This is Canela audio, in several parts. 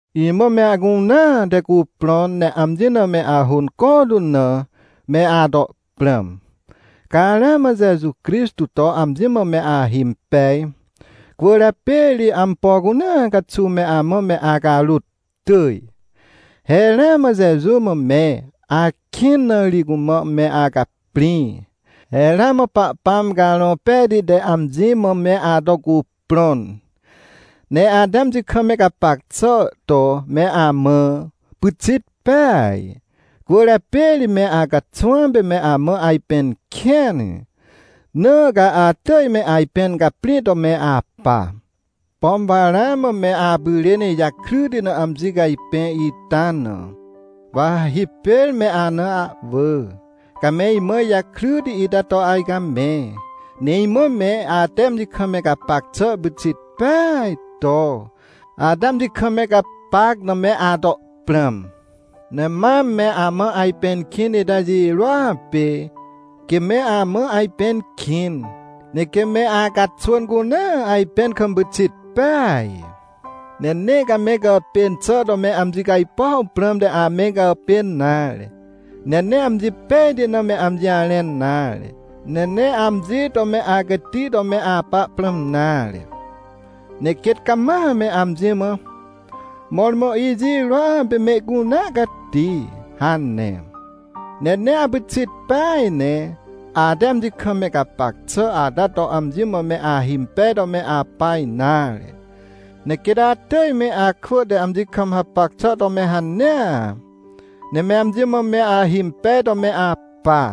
Imã me acunea te cuprõn ne amji na me ahônco tu na, me ato prãm. Ca ramã Jeju Crixtô to amji mã me ahimpej, cwỳrjapê ri ampo cunea caxuw me amã me acarôt tỳj. He ramã Jeju mã me akĩn na ri cumã me acaprĩ. He ramã Pahpãm Carõ Pejti te amji mã me ato cuprõn, ne ate amji kam me gapac xà to me amã pyxit peaj. Cwỳrjapê ri me acaxwãm pê me amã ajpẽn kĩn, na ca atỳj me ajpẽn caprĩ to me apa. Pom wa ramã me apyrên ijakryti na amji cajpẽ ita na, wa ha hipêr me ana ahwỳ, ca me imã ijakryti ita to ajcamẽ. Ne imã me ate amji kam me gapac xà pyxit peaj to, ate amji kam me gapac na me ato prãm. Ne mam me amã ajpẽn kĩn ita jirôa pê, quê me amã ajpẽn kĩn, ne quê me acaxwỳn cunea ajpẽn kam pyxit peaj. Ne nee ca me gàpên xà to me amji cajpuaw prãmte ame gàpên nare, ne nee amji pejti na me amji jarẽn nare, ne nee amji to me acati to me apa prãm nare. Ne quêt cama me amji mã: — Mõrmõ ijirôa pê mehcunea cati — hane. Ne nee apyxit peaj ne ate amji kam me gapac xà ata to amji mã me ahimpej to me apa nare, ne quêt atỳj me akwỳ te amji kam hapac xà to me hanea, ne me amji mã me ahimpej to me apa.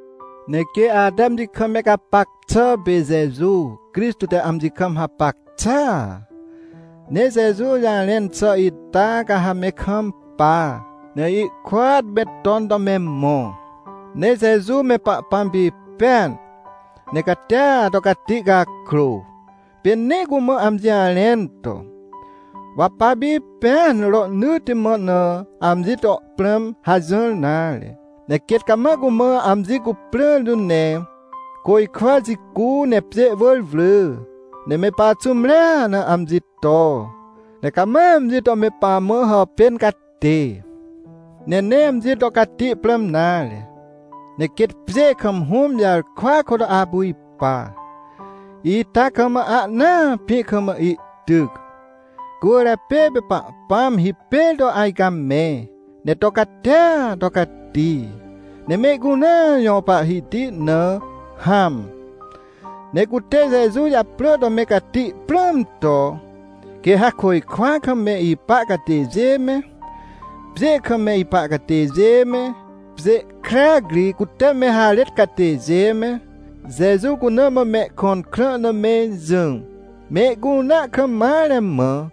Ne quê ate amji kam me gapac xà pê, Jeju Crixtô te amji kam hapac xàa. Ne Jeju jarẽn xà ita ca ha me kampa, ne ihkôat me ton to me mõ. Ne Jeju me Pahpãm pipẽan, ne catia to cati cakrô, pê nee cumã amji jarẽn to: “Wa papipẽan rohnỳtti mã na amji to prãm” hajỹr nare. Ne quêt cama cumã amji cuprãr tu, ne côjkwa jicu, ne pjê wỳr wrỳ, ne me paxũmrea na amji to, ne cama amji to me pamã hàpên catê. Ne nee amji to cati prãm nare, ne quêt pjê kam Hũm jarkwa kôt apu ipa, ita kam ahnaa pĩ kam ihtyc. Cwỳrjapê pê Pahpãm hipêr to ajcamẽ, ne to catia to cati, ne mehcunea jõ Pahhiti na hãm. Ne cute Jeju japrỳ to me cati prãm to, quê ha côjkwa kam me ipa catêjê me, pjê kam me ipa catêjê me, pjê krac ri cute me harêt catêjê me, Jeju cuna mã mehkõn krã na me jỹ, mehcunea kam mare mã,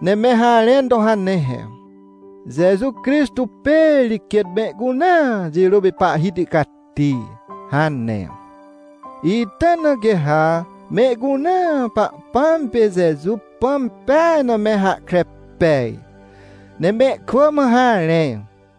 ne me harẽn to hane he: “Jeju Crixtô pê ri quêt mehcunea jirô pê Pahhiti cati” hane. Ita na quê ha mehcunea Pahpãm pê Jeju Pãm peaj na me hahkre pej, ne mehkwỳ mã harẽ.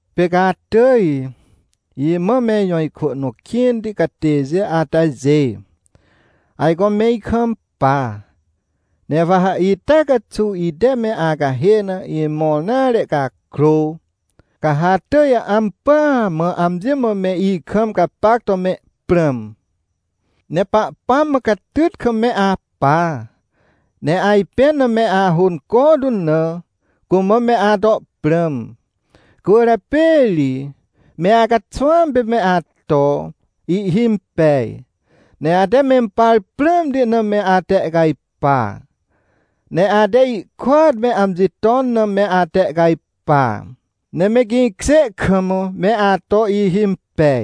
Pê ca atỳj, imã me ijõ ikwỳ nõ kĩnti catêjê atajê, ajco me ikampa, ne wa ha ita caxuw ite ame acahê na imõr nare cakrô, ca ha atỳj ampỳa mã amji mã me ikam gapac to me prãm. Ne Pahpãm mã catyt kam me apa, ne ajpẽn na me ahônco tu na, cumã me ato prãm. Cwỳrjapê ri me acaxwãm pê me ato ihhimpej, ne ate mempar prãmti na me atehcajpa, ne ate ihkôt me amji ton na me atehcajpa. Ne me gĩkjê kam me ato ihhimpej,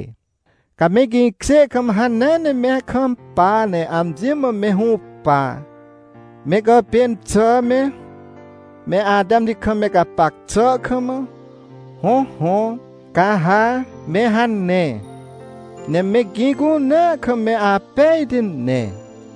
ca me gĩkjê kam, hanea ne me kampa ne amji mã me hũpa, me gàpên xà me, me ate amji kam me gapac xà kam. Hõhõ, ca ha me hane, ne me gĩ cunea kam me apejti ne.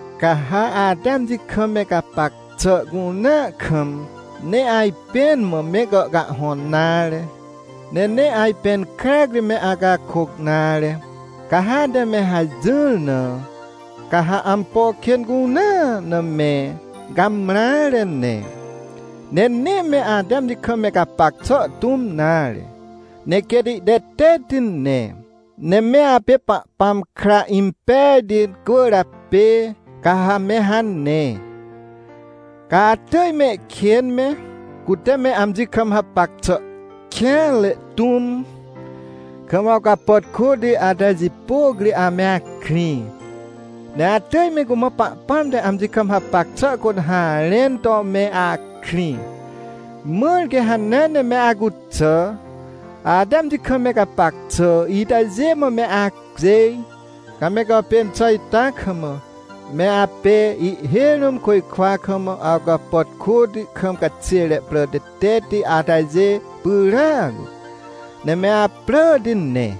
Ca ha ate amji kam me gapac xà cunea kam, nee ajpẽn mã me gàhcahhõn nare, ne nee ajpẽn krac ri me acakôc nare. Ca ha ate me hajỹr na, ca ha ampo kên cunea na me gamreare ne, ne nee me ate amji kam me gapac xà tũm nare, ne quêt ihtetetti ne. Ne me apê Pahpãm kra impejti cwỳrjapê ca ha me hane. Ca atỳj mehkên me, cute me amji kam hapac xà kêanre tũm, kam awcapàtkôti atajê jipôc ri ame akrĩ. Ne atỳj me cumã Pahpãm te amji kam hapac xà kôt harẽn to me akrĩ. Mãr quê hanea ne me acuxà, ate amji kam me gapac xà itajê mã me acjêj. Ca me gàpên xà ita kam, me apê ihhêj rũm côjkwa kam awcapàtkôti kam caxêre prà tetetti atajê pyràac, ne me apràti ne.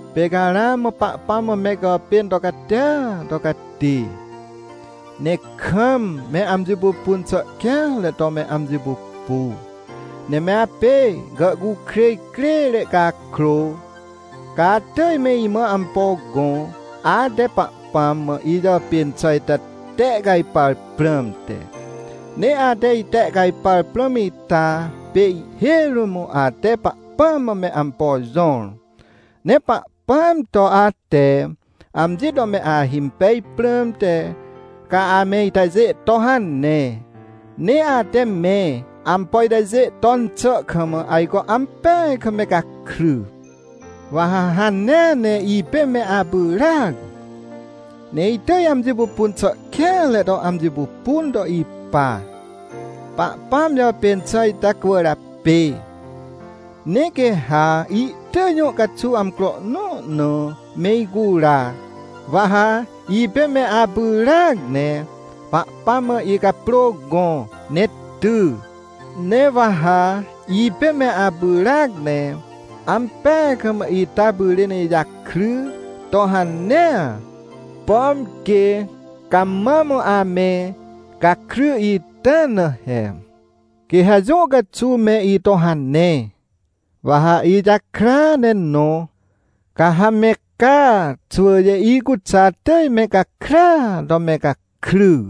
Pê ca ramã Pahpãm mã me gàpên to catia to cati, ne kam me amji pupun xà kêanre to me amji pupu. Ne me apê gàhcukrêj crêre cakrô, ca atỳj me imã ampo gõ, ate Pahpãm mã ijàpên xà ita tehcajpar prãmte. Ne ate itehcajpar prãm ita pê ihhêj rũm ate Pahpãm mã me ampo jõr. Ne Pahpãm to ate amji to me ahimpej prãmte, ca ame itajê to hane. Ne ate me ampo itajê ton xà kam, ajco ampeaj kam me gakry. Wa ha hanea ne ipê me apyràac, ne itỳj amji pupun xà kêanre to amji pupun to ipa, Pahpãm jàpên xà ita cwỳrjapê. Ne quê ha ihtỳj jũ caxuw amcro nõ na me icura, wa ha ipê me apyràac ne Pahpãm mã icaprô gõ ne ty. Ne wa ha ipê me apyràac ne ampeaj kam ita pyrên ijakry to hanea, pom quê ca mam ame gakry ita na he. Quê ha jũ caxuw me ito hane, wa ha ijakrya ne nõ. Ca ha me ca xwỳjê icuxà atỳj me gakrya to me gakry.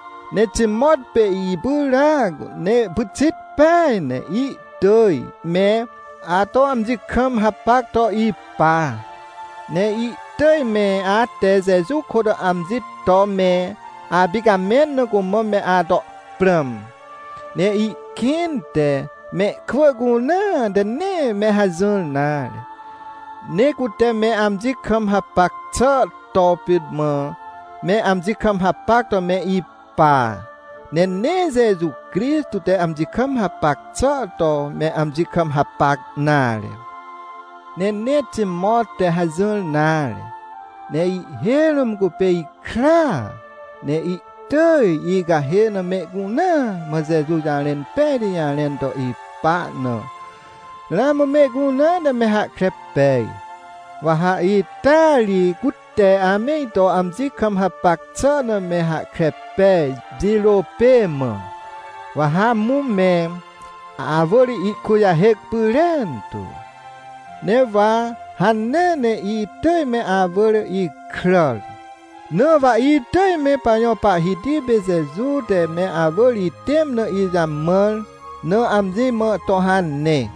Ne Timot pê ipyràac ne pyxit peaj, ne ihtỳj me ato amji kam hapac to ipa. Ne ihtỳj me ate Jeju kôt amji to me apicamẽn na cumã me ato prãm. Ne ihkĩnte mehkwỳ cunea te nee me hajỹr nare, ne cute me amji kam hapac xà to pit mã me amji kam hapac to me ipa, ne nee Jeju Crixtô te amji kam hapac xà to me amji kam hapac nare. Ne nee Timot te hajỹr nare, ne ihhêj rũm cupê ikraa, ne ihtỳj icahê na mehcunea mã Jeju jarẽn pejti jarẽn to ipa na, ramã mehcunea te me hahkre pej. Wa ha ita ri cute ame ito amji kam hapac xà na me hahkre pej jirô pê mã, wa ha amũ me awỳr ihkujahêc pyrentu. Ne wa hanea ne itỳj me awỳr ikràr. Na wa itỳj me pajõ Pahhiti pê Jeju te me awỳr itẽm na ijamãr na, amji mã to hane.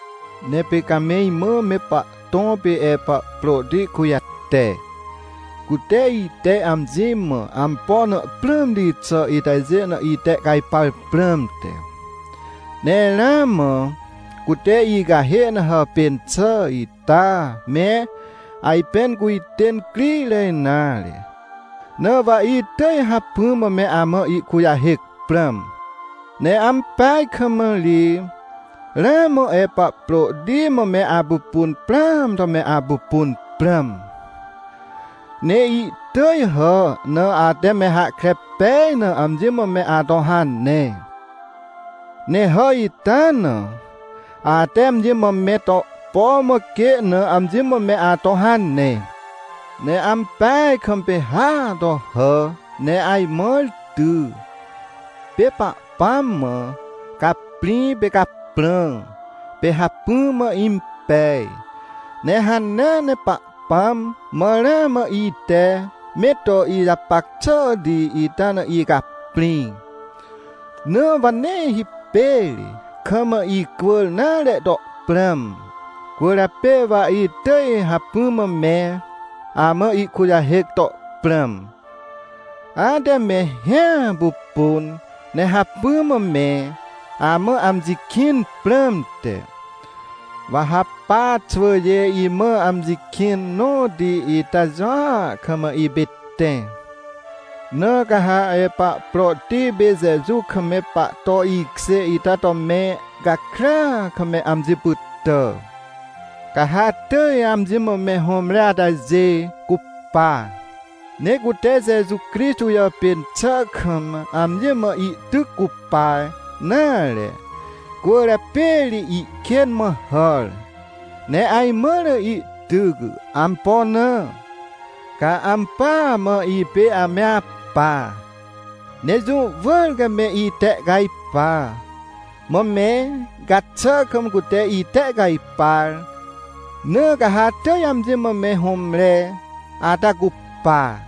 Ne pê ca me imã me pahtõ pê Epaprôti kujate, cute ite amji mã ampo na prãmti xà itajê na itehcajpar prãmte. Ne ramã cute icahê na hàpên xà ita me, ajpẽn cujtên crire nare. Na wa itỳj hacpỹ mã me amã ihkujahêc prãm. Ne ampeaj kam ri ramã Epaprôti mã me apupun prãam to me apupun prãm. Ne ihtỳj hà na ate me hahkre pej na amji mã me ato hane. Ne hà ita na, ate amji mã me to põ mã quê na, amji mã me ato hane. Ne ampeaj kam pê hàa to hà, ne ajmãr ty. Pê Pahpãm mã caprĩ pê caprã, pê hacpỹa mã impej. Ne hanea ne Pahpãm mã ramã ite me to ijapac xàhti ita na icaprĩ, na wa nee hipêr kam icwỳr nare to prãm. Cwỳrjapê wa itỳj hacpỹa mã me amã ihkujahêc to prãm, ate me hĩa pupun ne hacpỹ mã me amã amji kĩn prãmte. Wa ha pa xwỳjê imã amji kĩn nõti ita jũa kam ipê tẽ. Na ca ha Epaprôti pê Jeju kam me pahto ihkjê ita to me gakrya kam me amji pytà. Ca ha atỳj amji mã me hũmre atajê cupa. Ne cute Jeju Crixtô jàpên xà kam amji mã ihtyc cupa nare, cwỳrjapê ri ihkên mã hàr, ne ajmãr ihtyc. Ampo na? Ca ampỳa mã ipê ame apa, ne jũ wỳr ca me itehcajpa, mã me gaxà kam cute itehcajpar. Na ca ha atỳj amji mã me hũmre ata cupa,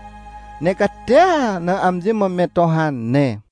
ne catia na amji mã me to hane.